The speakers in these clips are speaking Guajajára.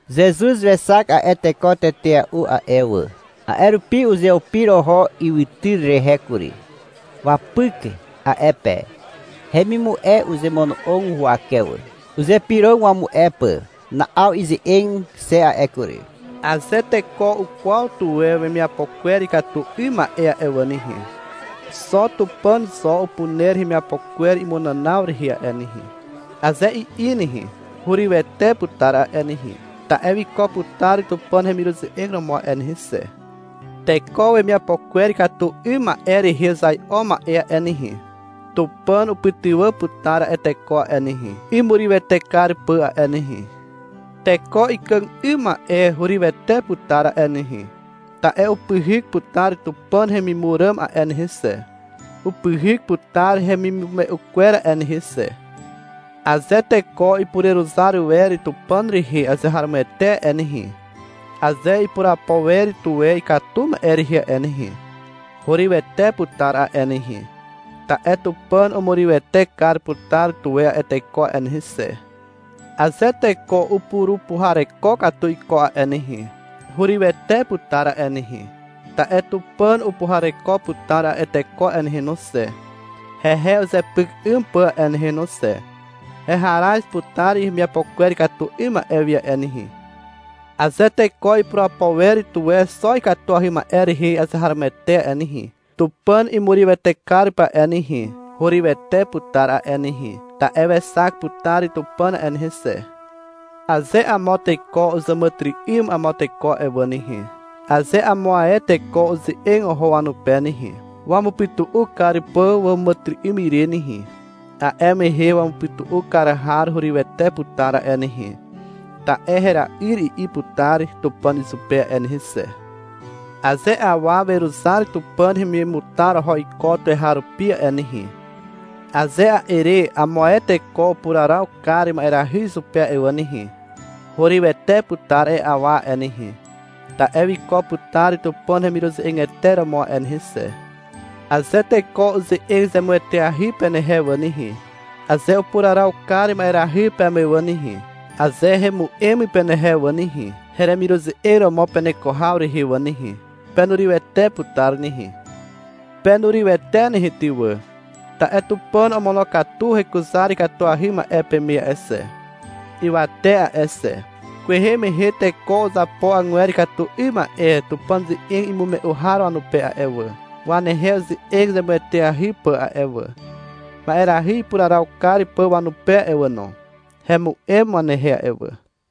Zezuz wexak a'e teko tetea'u a'e wà. A'e rupi uzeupir oho ywytyr rehe kury. Wapyk a'e pe. Hemimu'e uzemono'og huwake wà. Uzypyrog wamu'e pà. Na'aw ize'eg xe a'e kury. — Aze teko ukwaw tuwe wemiapo kwer ikatu 'ym ma'e a'e wà nehe, — Xo Tupàn zo upuner heremiapo kwer imunànaw rehe a'e nehe, aze i'i nehe, hurywete putar a'e nehe. Ta'e wiko putar Tupàn hemiruze'eg romo a'e nehe xe. Teko wemiapo kwer ikatu 'ym ma'e rehe uzai'o ma'e a'e nehe, Tupàn upytywà putar a'e teko a'e nehe, imurywete kar pà a'e nehe. Teko ikàg 'ym ma'e hurywete putar a'e nehe, ta'e upyhyk putar Tupàn hemimur ràm a'e nehe xe, upyhyk putar hemimume'u kwer a'e nehe xe. Aze teko ipureruzar wer Tupàn rehe azeharomoete a'e nehe, aze ipurapo wer tuwe ikatu ma'e rehe a'e nehe, hurywete putar a'e nehe, ta'e Tupàn umurywete kar putar tuwe a'e teko a'e nehe xe. Aze teko upurupuhareko katu iko a'e nehe, hurywete putar a'e nehe, ta'e Tupàn upuhareko putar a'e teko a'e nehe no xe, hehe uzepyk 'ym pà a'e nehe no xe. Heharaz putar hemiapo kwer ikatu 'ym ma'e wi a'e nehe. Aze teko ipurapo wer tuwe xo ikatuahy ma'e rehe azeharomoete a'e nehe, Tupàn imurywete kar pà a'e nehe, hurywete putar a'e nehe, ta'e wexak putar Tupàn a'e nehe xe. Aze amo teko uzàmàtyry'ym amo teko a'e wà nehe, aze amo ae teko uze'eg oho wanupe nehe, wamupytu'u kar pà wàmàtyry'ym ire nehe, a'e mehe wamupytu'u kar har hurywete putar a'e nehe, ta'e — Hera'yr, i'i putar Tupàn izupe a'e nehe xe. Aze awa weruzar Tupàn hemimutar oho iko tuweharupi a'e nehe, aze a'e re amo ae teko upuraraw kar ma'erahy izupe a'e wà nehe, hurywete putar a'e awa a'e nehe, ta'e wiko putar Tupàn hemiruze'egete romo a'e nehe xe. Aze teko uze'eg zemueteahy penehe wà nehe, aze upuraraw kar ma'erahy peme wà nehe, aze hemu'em penehe wà nehe, heremiruze'eg romo peneko haw rehe wà nehe, penurywete putar nehe. Penurywete nehe ty wà, ta'e Tupàn omonokatu hekuzar ikatuahy ma'e peme a'e xe, ywate a'e xe. Kwehe mehe teko uzapo agwer ikatu 'ym ma'e Tupàn ze'eg imume'u har wanupe a'e wà, wanehe uze'eg zemueteahy pà a'e wà, ma'erahy ipuraraw kar pà wanupe a'e wà no. Hemu'em wanehe a'e wà.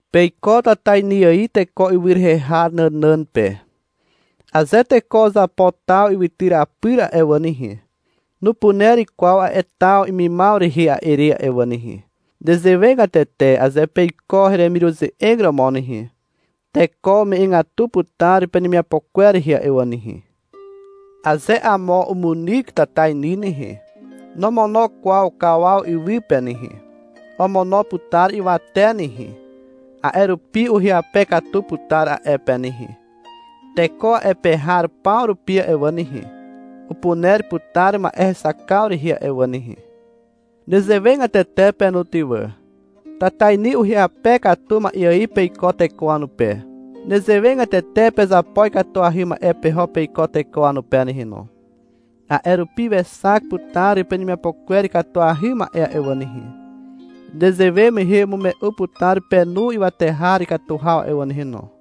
Peiko tatainy ài teko ywy rehe har nànàn pe. Aze teko uzapo taw ywytyr apyr a'e wà nehe, nupuner kwaw a'e taw imimaw rehe a'e re a'e wà nehe. Nezewegatete aze peiko heremiruze'eg romo nehe, teko ume'egatu putar penemiapo kwer rehe a'e wà nehe. Aze amo umunyk tatainy nehe, nomono kwaw kawaw iwy pe nehe. Omono putar ywate nehe. A'e rupi uhyape katu putar a'e pe nehe. Teko a'e pe har paw rupi a'e wà nehe, upuner putar ma'e hexakaw rehe a'e wà nehe. Nezewegatete pe no ty wà. Tatainy uhyape katu ma'e ài peiko teko wanupe. Nezewegatete pezapo ikatuahy ma'e peho peiko teko wanupe nehe no. A'e rupi wexak putar penemiapo kwer ikatuahy ma'e a'e wà nehe. Nezewe mehe umume'u putar penu ywate har ikatu haw a'e wà nehe no.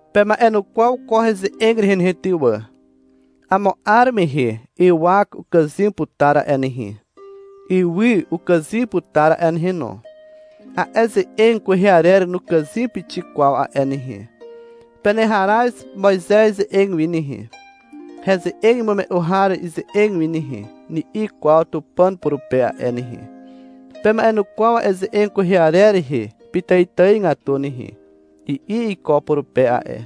Pema'enukwaw ko heze'eg rehe nehe ty wà. Amo 'ar mehe ywak ukàzym putar a'e nehe, ywy ukàzym putar a'e nehe no. A'e ze'eg kwehe arer nukàzym pixik kwaw a'e nehe. — Peneharaz Moizez ze'eg wi nehe, heze'eg imume'u har ize'eg wi nehe, ni'i kwaw Tupàn purupe a'e nehe. — Pema'enukwaw a'e ze'eg kwehe arer rehe pitàitàigatu nehe, i'i iko purupe a'e.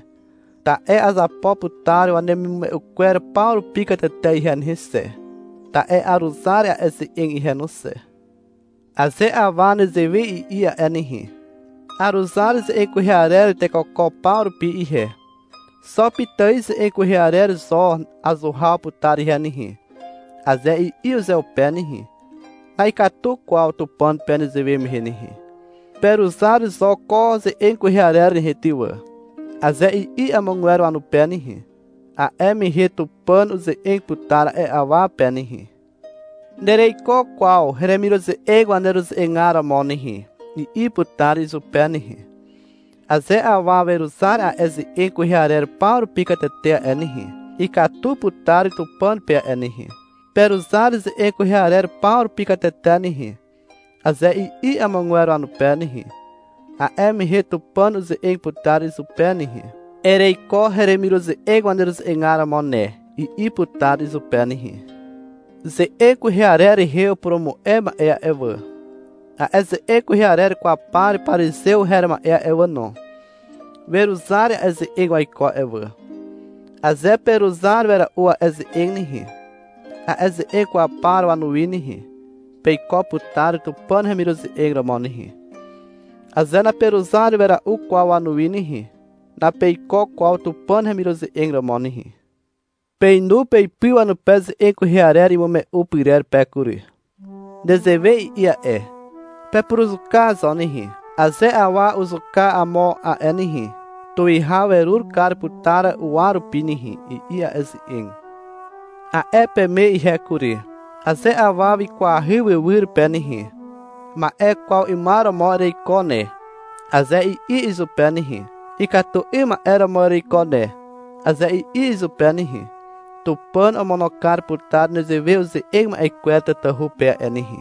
Ta'e azapo putar wanemimume'u kwer paw rupi katete ihe nehe xe, ta'e aruzar a'e ze'eg ihe no xe. Aze awa nezewe i'i a'e nehe. — Aruzar ze'eg kwehe arer tekoko paw rupi ihe. Xo pitài ze'eg kwehe arer zo azuhaw putar ihe nehe, aze i'i uzeupe nehe, na'ikatu kwaw Tupàn pe nezewe mehe nehe. — Peruzar zo ko ze'eg kwehe arer nehe ty wà, aze i'i amogwer wanupe nehe, a'e mehe Tupàn uze'eg putar a'e awa pe nehe. — Nereiko kwaw heremiruze'eg waneruze'egar romo nehe, i'i putar izupe nehe. Aze awa weruzar a'e ze'eg kwehe arer paw rupi katete a'e nehe, ikatu putar Tupàn pe a'e nehe. — Peruzar ze'eg kwehe arer paw rupi katete nehe, aze i'i amogwer wanupe nehe, a'e mehe Tupàn uze'eg putar izupe nehe. — Ereiko heremiruze'eg waneruze'egar romo ne, i'i putar izupe nehe. Ze'eg kwehe arer rehe upurumu'e ma'e a'e wà, a'e ze'eg kwehe arer kwaw par parizew her ma'e a'e wà no, weruzar a'e ze'eg waiko a'e wà. Aze peruzar wera'u a'e ze'eg nehe, a'e ze'eg kwaw par wanuwi nehe, peiko putar Tupàn hemiruze'eg romo nehe. Aze naperuzar wera'u kwaw wanuwi nehe, napeiko kwaw Tupàn hemiruze'eg romo nehe. — Peinu peipy wanupe ze'eg kwehe arer imume'u pyrer pe kury. Nezewe i'i a'e. — Pepuruzuka zo nehe. Aze awa uzuka amo a'e nehe, tuwihaw werur kar putar uwa rupi nehe, i'i a'e ze'eg. A'e peme ihe kury. — Aze awa wikwahy wywyr pe nehe, — Ma'e kwaw 'ymar romo ereiko ne, aze i'i izupe nehe, — Ikatu 'ym ma'e romo ereiko ne, aze i'i izupe nehe Tupàn omono kar putar nezewe uze'eg ma'e kwer tatahu pe a'e nehe.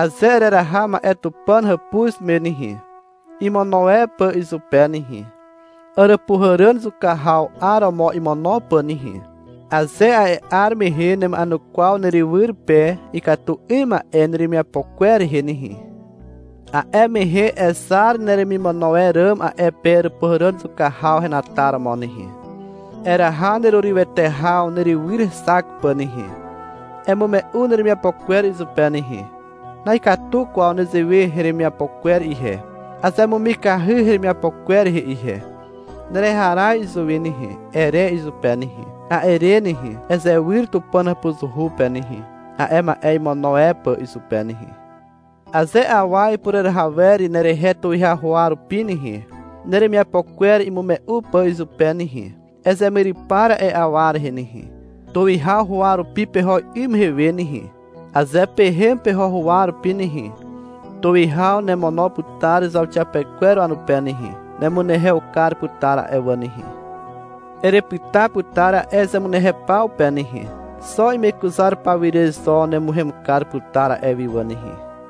Aze ereraha ma'e Tupàn hàpuz me nehe, imono e pà izupe nehe, àràpuhàràn zuka haw 'aromo imono pà nehe, aze a'e 'ar mehe nema'enukwaw nerywyr pe ikatu 'ym ma'e neremiapo kwer rehe nehe, a'e mehe ezar neremimono e ràm a'e pe àràpuhàràn zuka haw henataromo nehe. Eraha nerurywete haw nerywyr hexak pà nehe. Emume'u neremiapo kwer izupe nehe, — Na'ikatu kwaw newe heremiapo kwer ihe, azemumikahy heremiapo kwer rehe ihe, nereharaz izuwi nehe, ere izupe nehe. A'e re nehe, ezewyr Tupàn hàpuzuhu pe nehe, a'e ma'e imono e pà izupe nehe. Aze awa ipureraha wer nerehe tuwihaw huwa rupi nehe, neremiapo kwer imume'u pà izupe nehe, ezemyrypar a'e awa rehe nehe, tuwihaw huwa rupi peho 'ym mehe we nehe. Aze pehem peho huwa rupi nehe, tuwihaw nemono putar zauxiapekwer wanupe nehe. Nemunehew kar putar a'e wà nehe. Erepyta putar a'e zemunehew paw pe nehe. Xo imekuzar pawire zo nemuhem kar putar a'e wi wà nehe.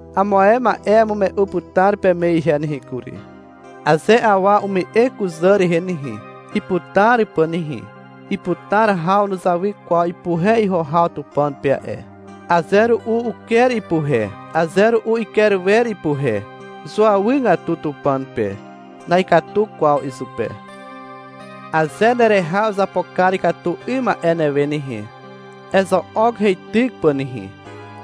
Amo ae ma'e amume'u putar peme ihe nehe kury. — Aze awa ume'e kuzà rehe nehe, iputar pà nehe, iputar haw nuzawy kwaw ipuhe iho haw Tupàn pe a'e. Aze ru'u uker ipuhe, aze ru'u iker wer ipuhe. Zuawygatu Tupàn pe. Na'ikatu kwaw izupe. Aze nereha uzapo kar ikatu 'ym ma'e newe nehe, ezo'ok heityk pà nehe.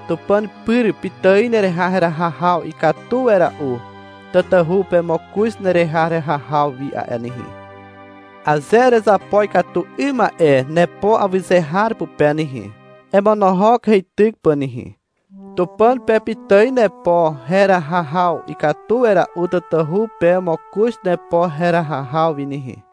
Tupàn pyr pitài nereha heraha haw ikatu wera'u, tatahu pe mokoz nereha heraha haw wi a'e nehe. Aze erezapo ikatu 'ym ma'e nepo awyze har pupe nehe, emonohok heityk pà nehe. Tupàn pe pitài nepo heraha haw ikatu wera'u tatahu pe mokoz nepo heraha haw wi nehe.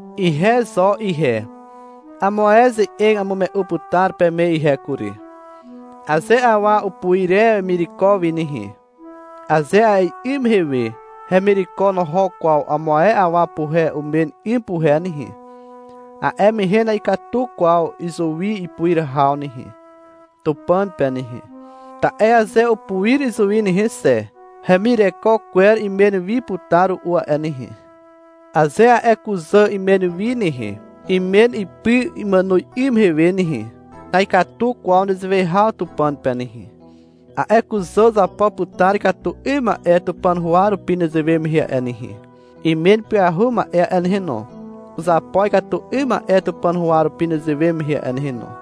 Ihe zo ihe, amo ae ze'eg amume'u putar peme ihe kury. — Aze awa upuir e wemireko wi nehe, aze a'e 'ym mehe hemireko noho kwaw amo ae awa puhe umen 'ym puhe nehe, a'e mehe na'ikatu kwaw izuwi ipuir haw nehe, Tupàn pe nehe. Ta'e aze upuir izuwi nehe xe, hemireko kwer imen wi putar ru'u a'e nehe. Aze a'e kuzà imen wi nehe, imen ipy imàno 'ym mehe we nehe, na'ikatu kwaw nezewe haw Tupàn pe nehe. A'e kuzà uzapo putar ikatu 'ym ma'e Tupàn huwa rupi nezewe mehe a'e nehe. Imen ipyahu ma'e a'e nehe no, uzapo ikatu 'ym ma'e Tupàn huwa rupi nezewe mehe a'e nehe no.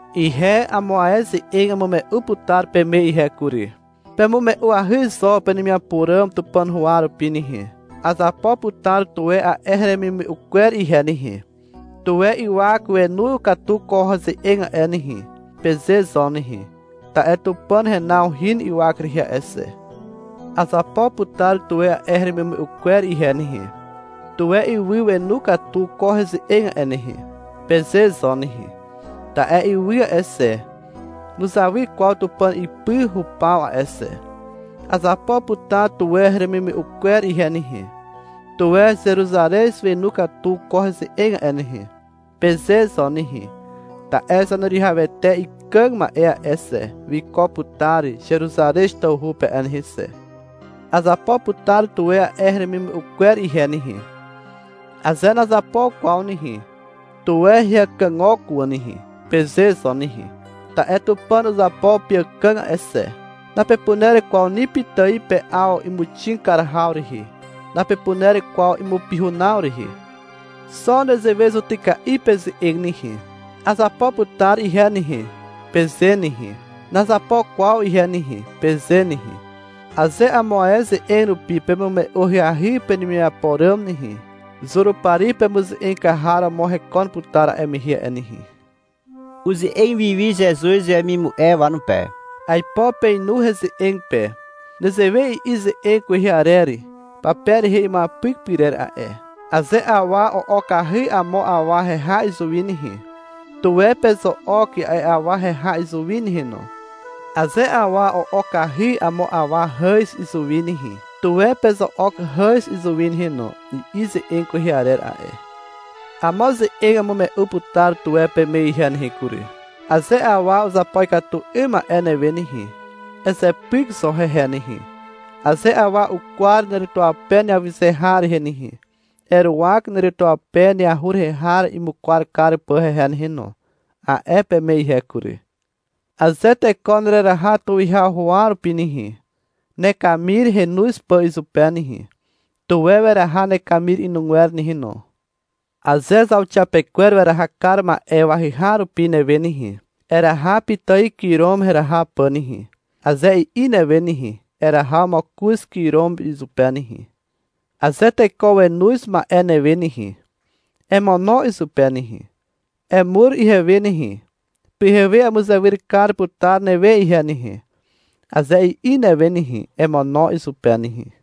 Ihe amo ae ze'eg amume'u putar peme ihe kury. — Pemume'uahy zo penemiapo ràm Tupàn huwa rupi nehe. — Azapo putar tuwe a'e heremimume'u kwer ihe nehe. Tuwe ywak wenu katu ko heze'eg a'e nehe, peze zo nehe. Ta'e Tupàn henaw hin ywak rehe a'e xe. — Azapo putar tuwe a'e heremimume'u kwer ihe nehe. Tuwe ywy wenu katu ko heze'eg a'e nehe, peze zo nehe. Ta'e ywy a'e xe, nuzawy kwaw Tupàn ipy hupaw a'e xe. — Azapo putar tuwe heremimume'u kwer ihe nehe. Tuwe Zeruzarez wenu katu ko heze'eg a'e nehe, peze zo nehe. Ta'e Zaneruwihawete ikàg ma'e a'e xe, wiko putar Zeruzarez tawhu pe a'e nehe xe. — Azapo putar tuwe a'e heremimume'u kwer ihe nehe. Aze nazapo kwaw nehe, tuwe heakagok wà nehe, peze zo nehe, ta'e Tupàn uzapo peàkàg a'e xe. Napepuner kwaw ni pitài pe'aw imuxig kar haw rehe. Napepuner kwaw imupihunaw rehe. Xo nezewe zutyka'i peze'eg nehe. — Azapo putar ihe nehe, peze nehe. — Nazapo kwaw ihe nehe, peze nehe. Aze amo ae ze'eg rupi pemume'u ahyahy penemiapo ràm nehe, Zurupari pemuze'eg kar har romo hekon putar a'e mehe a'e nehe. (Uze'eg wiwi Zezuz wemimu'e wanupe.) — Aipo peinu heze'eg pe. Nezewe i'i ze'eg kwehe arer pape rehe imuapyk pyrer a'e. — Aze awa o'okahy amo awa heha izuwi nehe, tuwe pezo'ok a'e awa heha izuwi nehe no. Aze awa o'okahy amo awa hàz izuwi nehe, tuwe pezo'ok hàz izuwi nehe no, i'i ze'eg kwehe arer a'e. Amo ze'eg amume'u putar tuwe peme ihe nehe kury. — Aze awa uzapo ikatu 'ym ma'e newe nehe, ezepyk zo hehe nehe. Aze awa ukwar neretuape neawyze har rehe nehe, eruwak neretuape neahur rehe har imukwar kar pà hehe nehe no, a'e peme ihe kury. Aze teko nereraha tuwihaw huwa rupi nehe, nekamir henoz pà izupe nehe, tuwe weraha nekamir inugwer nehe no. Aze zauxiapekwer weraha kar ma'e wahyhaw rupi newe nehe, — Eraha pitài kirom heraha pà nehe, aze i'i newe nehe, eraha mokoz kirom izupe nehe. Aze teko wenoz ma'e newe nehe, emono izupe nehe. — Emur ihewe nehe, pyhewe amuzewyr kar putar newe ihe nehe, aze i'i newe nehe, emono izupe nehe.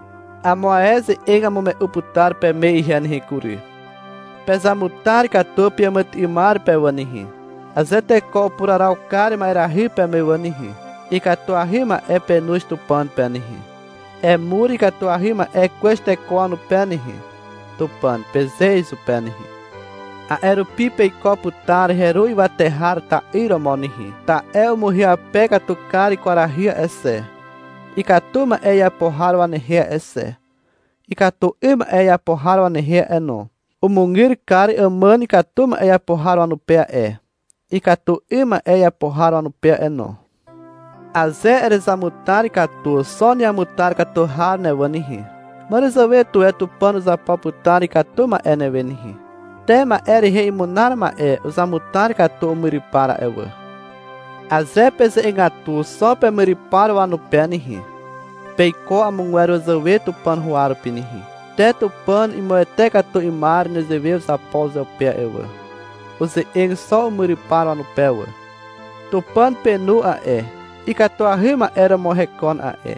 Amo ae ze'eg amume'u putar peme ihe nehe kury. — Pezamutar katu peàmàtyry'ymar pe wà nehe. Aze teko upuraraw kar ma'erahy peme wà nehe, ikatuahy ma'e penoz Tupàn pe nehe. — Emur ikatuahy ma'e kwez teko wanupe nehe, Tupàn, peze izupe nehe. A'e rupi peiko putar heru ywate har ta'yr romo nehe. Ta'e umuhyape katu kar kwarahy a'e xe, ikatu ma'e iapo har wanehe a'e xe, ikatu 'ym ma'e iapo har wanehe a'e no. Umugyr kar àmàn ikatu ma'e iapo har wanupe a'e, ikatu 'ym ma'e iapo har wanupe a'e no. Aze erezamutar katu xo neamutar katu har ne wà nehe, màràzàwe tuwe Tupàn uzapo putar ikatu ma'e newe nehe. Te ma'e rehe imunar ma'e uzamutar katu umyrypar a'e wà. Aze peze'egatu xo pemyrypar wanupe nehe, peiko amogwer wazàwe Tupàn huwa rupi nehe. Te Tupàn imuwete katu 'ymar nezewe uzapo uzeupe a'e wà. Uze'eg xo umyrypar wanupe wà. Tupàn penu a'e, ikatuahy ma'e romo hekon a'e.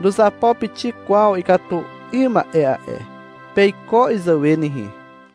Nuzapo pixik kwaw ikatu 'ym ma'e a'e. Peiko izàwe nehe.